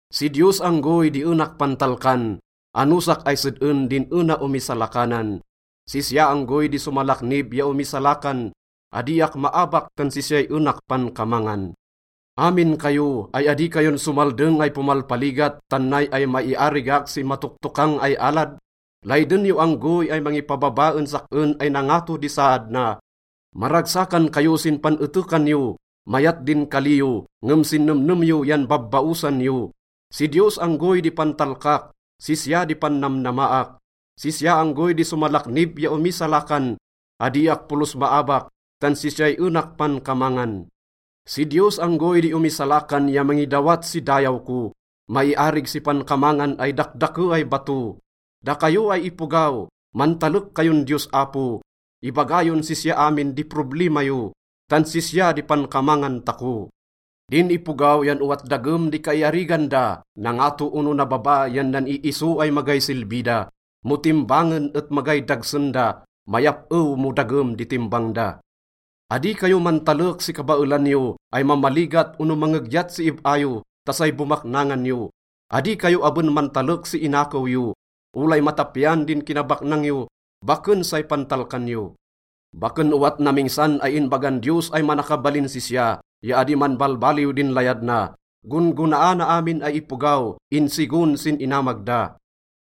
Si Diyos anggoy di enak pantalkan, anosak ay sed-en din ena omisalakanan. Sisya anggoy di somalaknib ya omisalakan, adiak maabak tan sisyay enak pankamangan. Amin kayo, ay adi kayon somaldeng ay pomalpaligat tan nay ay maiarigak si matoktokang ay alad? Layden yo anggoy ay mangipababa en sak-en ay nangato di saad na. Maragsakan kayo sin pan-etekan yo. Mayat din kali yo ngem sin nemnem yo yan babbaosan yo. Si Diyos anggoy di pantalkak, sisya di pannamnamaak. Sisya anggoy di somalaknib ya omisalakan. Adiak polos maabak tan sisyay enak pankamangan. Si Diyos anggoy di omisalakan ya mangidawat si dayaw ko, maiarig si pankamangan ay dakdake ay bato. Dakayo ay ipogaw, mantalek kayon Diyos Apo. Ibaga yon sisya amin di problima yo, tan sisya di pankamangan tako. Din ipogaw yan owat dagem di kaiarigan da, nangato ono nababa yan nan-iiso ay magay silbi da. Mo timbangen et magay dagsen da, mayap-ew mo dagem di timbang da. Adi kayo mantalek si kabaelan yo ay mamaligat ono mangegyat si ib-a yo ta say bomaknangan yo. Adi kayo aben mantalek si inakew yo. Olay matapian din kinabaknang yo, baken say pantalkan yo. Baken owat namingsan ay inbagan Diyos ay manakabalin sisya ya adi manbalbaliw din layad na. Gon-gonaana amin ay ipogaw insigon sin inamag da.